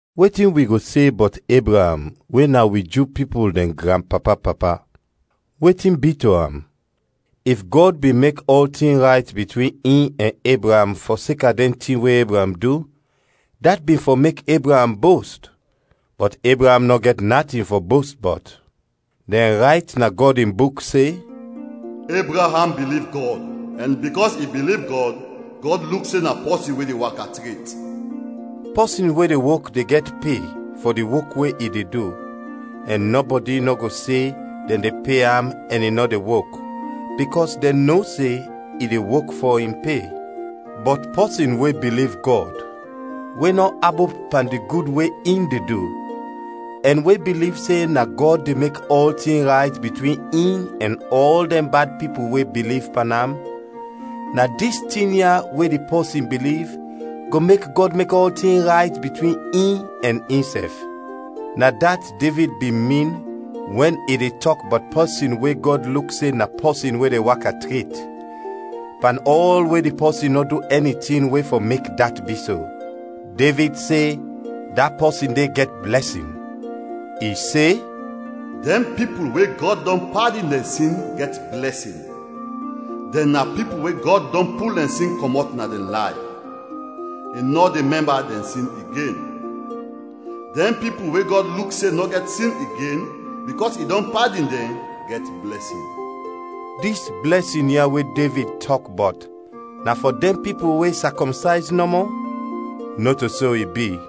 Wetin wi go se bɔt Ebraam we na wi Ju pipul dɛn granpapa-papa? Wetin bi to am? If Gɔd bin mek ɔltin rayt bitwin in ɛn Ebraam fɔseka dɛn tin we Ebraam du, dat bin fɔ mek Ebraam bost, bɔt Ebraam nɔ gɛt natin fɔ bost bɔt. Dɛn rayt na Gɔd in Buk se, “Ebraam biliv Gɔd ɛn bikɔs i biliv Gɔd, Gɔd luk se na pɔsin we de waka tret.” Pɔsin we de wok de gɛt pe fɔ di wok we i de du, ɛn nɔbɔdi nɔ go se dɛn de pe am ɛn i nɔ de wok, bikɔs dɛn no se i de wok fɔ in pe. Bɔt pɔsin we biliv Gɔd, we nɔ abop pan di gud we in de du, ɛn we biliv se na Gɔd de mek ɔltin rayt bitwin in ɛn ɔl dɛn bad pipul we biliv pan am, na dis tin ya we di pɔsin biliv go mek Gɔd mek ɔltin rayt bitwin in ɛn insɛf. Na dat Devid bin min wɛn i de tɔk bɔt pɔsin we Gɔd luk se na pɔsin we de waka tret, pan ɔl we di pɔsin nɔ du ɛni tin we fɔ mek dat bi so. Devid se da pɔsin de gɛt blɛsin. I se, “Dɛn pipul we Gɔd dɔn padin dɛn sin, gɛt blɛsin, dɛn na pipul we Gɔd dɔn pul dɛn sin kɔmɔt na dɛn layf, i nɔ de mɛmba dɛn sin igen. Dɛn pipul we Gɔd luk se nɔ gɛt sin igen bikɔs i dɔn padin dɛn, gɛt blɛsin!” Dis blɛsin ya we Devid tɔk bɔt na fɔ dɛn pipul we sakɔmsayz nɔmɔ? Nɔto so i bi,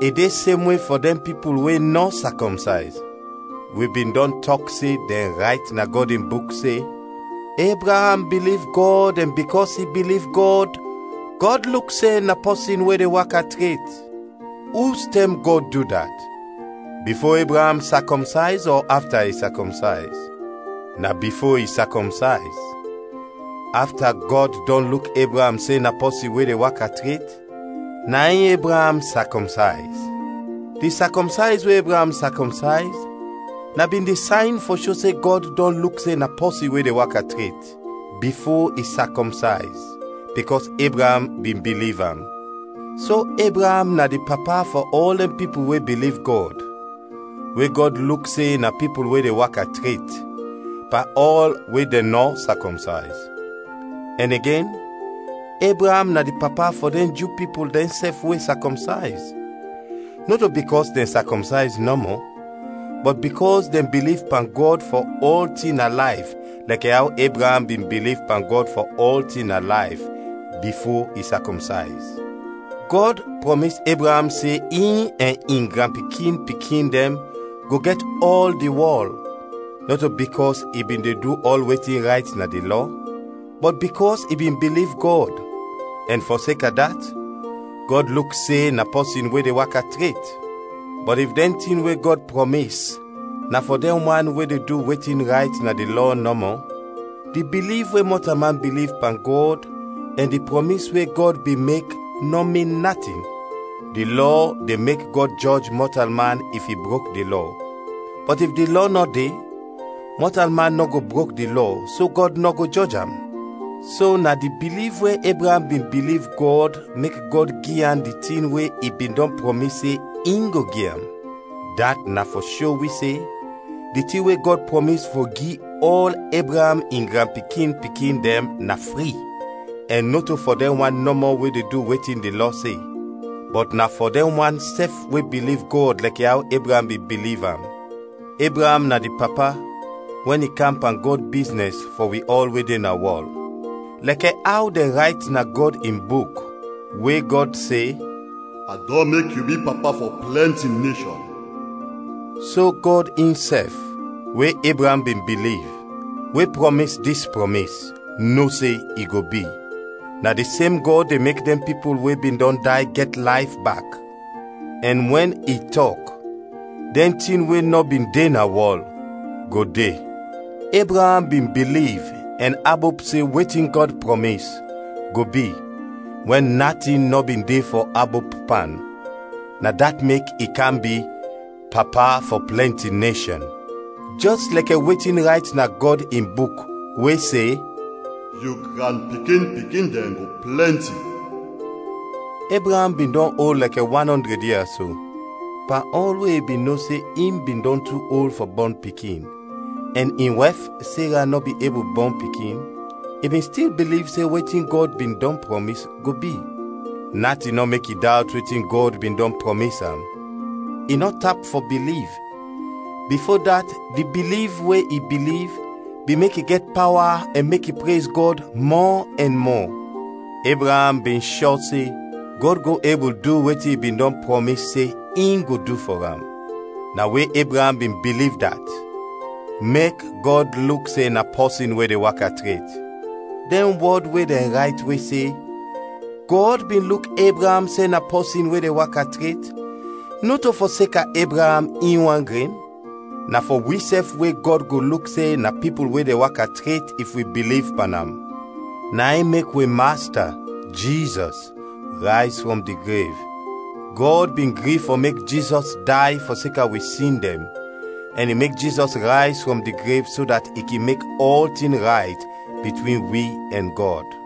i de semwe fɔ dɛn pipul we nɔ sakɔmsayz. Wi bin dɔn tɔk se dɛn rayt na Gɔd in Buk se, “Ebraam biliv Gɔd ɛn bikɔs i biliv Gɔd, Gɔd luk se na pɔsin we de waka tret.” Ustɛm Gɔd du dat bifo Ebraam sakɔmsayz ɔ afta i sakɔmsayz? Na bifo i sakɔmsayz. Afta Gɔd dɔn luk Ebraam se na pɔsin we de waka tret, na in Ebraam sakɔmsayz. Di sakɔmsayz we Ebraam sakɔmsayz na bin di sayn fɔ sho se Gɔd dɔn luk se na pɔsin we de waka tret, bifo i sakɔmsayz, bikɔs Ebraam bin biliv am. So Ebraam na di papa fɔ ɔl dɛn pipul we biliv Gɔd, we Gɔd luk se na pipul we de waka tret, pan ɔl we dɛn nɔ sakɔmsayz. Ɛn igen, Ebraam na di papa fɔ dɛn Ju pipul dɛnsɛf we sakɔmsayz, nɔto bikɔs dɛn sakɔmsayz nɔmɔ, bɔt bikɔs dɛn biliv pan Gɔd fɔ ɔltin na layf lɛkɛ aw Ebraam bin biliv pan Gɔd fɔ ɔltin na layf, bifo i sakɔmsayz. Gɔd prɔmis Ebraam se in ɛn in granpikin-pikin dɛn go gɛt ɔl di wɔl; nɔto bikɔs i bin de du ɔl wetin rayt na di Lɔ, bɔt bikɔs i bin biliv Gɔd, ɛn fɔseka dat, Gɔd luk se na pɔsin we de waka tret. Bɔt if dɛn tin we Gɔd prɔmis na fɔ dɛn wan we de du wetin rayt na di Lɔ nɔmɔ, di biliv we mɔtalman biliv pan Gɔd ɛn di prɔmis we Gɔd bin mek nɔ min natin. Di Lɔ de mek Gɔd jɔj mɔtalman if i brok di Lɔ. Bɔt if di Lɔ nɔ de, mɔtalman nɔ go brok di Lɔ so Gɔd nɔ go jɔj am. So na di biliv we Ebraam bin biliv Gɔd mek Gɔd gi am di tin we i bin dɔn prɔmis se in go gi am. Dat na fɔ sho wi se di tin we Gɔd prɔmis fɔ gi ɔl Ebraam in granpikin-pikin dɛn na fri, ɛn nɔto fɔ dɛn wan nɔmɔ we de du wetin di Lɔ se, bɔt na fɔ dɛn wan sɛf we biliv Gɔd lɛkɛ aw Ebraam bin biliv am. Ebraam na di papa wɛn i kam pan Gɔd biznɛs fɔ wi ɔl we de na wɔl. Lɛkɛ aw dɛn rayt na Gɔd in Buk, we Gɔd se, “A dɔn mek yu bi papa fɔ plɛnti neshɔn.” So Gɔd insɛf, we Ebraam bin biliv, we prɔmis dis prɔmis, no se i go bi. Na di sem Gɔd de mek dɛn pipul we bin dɔn day gɛt layf bak, ɛn wɛn i tɔk dɛn tin we nɔ bin de na wɔl, go de. Ebraam bin biliv ɛn abop se wetin Gɔd prɔmis, go bi, wɛn natin nɔ bin de fɔ abop pan, na dat mek i kam bi “Papa fɔ plɛnti neshɔn.” Jɛs lɛkɛ wetin rayt na Gɔd in Buk, we se, “Yu granpikin-pikin dɛn go plɛnti.” Ebraam bin dɔn ol lɛkɛ wan ɔndrɛd ia so. Pan ɔl we i bin no se in bin dɔn tu ol fɔ bɔn pikin, ɛn in wɛf Sera nɔ bin ebul bɔn pikin, i bin stil biliv se wetin Gɔd bin dɔn prɔmis, go bi. Natin nɔ mek i dawt wetin Gɔd bin dɔn prɔmis am, i nɔ tap fɔ biliv, bifo dat di biliv we i biliv bin mek i gɛt pawa ɛn mek i prez Gɔd mɔ ɛn mɔ. Ebraam bin shɔ se Gɔd go ebul du wetin i bin dɔn prɔmis se in go du fɔ am. Na we Ebraam bin biliv dat “Mek Gɔd luk se na pɔsin we de waka tret.” Dɛn wɔd we dɛn rayt we se, “Gɔd bin luk Ebraam se na pɔsin we de waka tret,” nɔto fɔseka Ebraam in wan gren. Na fɔ wisɛf we Gɔd go luk se na pipul we de waka tret if wi biliv pan am. Na in mek wi Masta, Jizɔs rayz frɔm di grev. Gɔd bin gri fɔ mek Jizɔs day fɔseka wi sin dɛn, ɛn i mek Jizɔs rayz frɔm di grev so dat i kin mek ɔltin rayt bitwin wi ɛn Gɔd.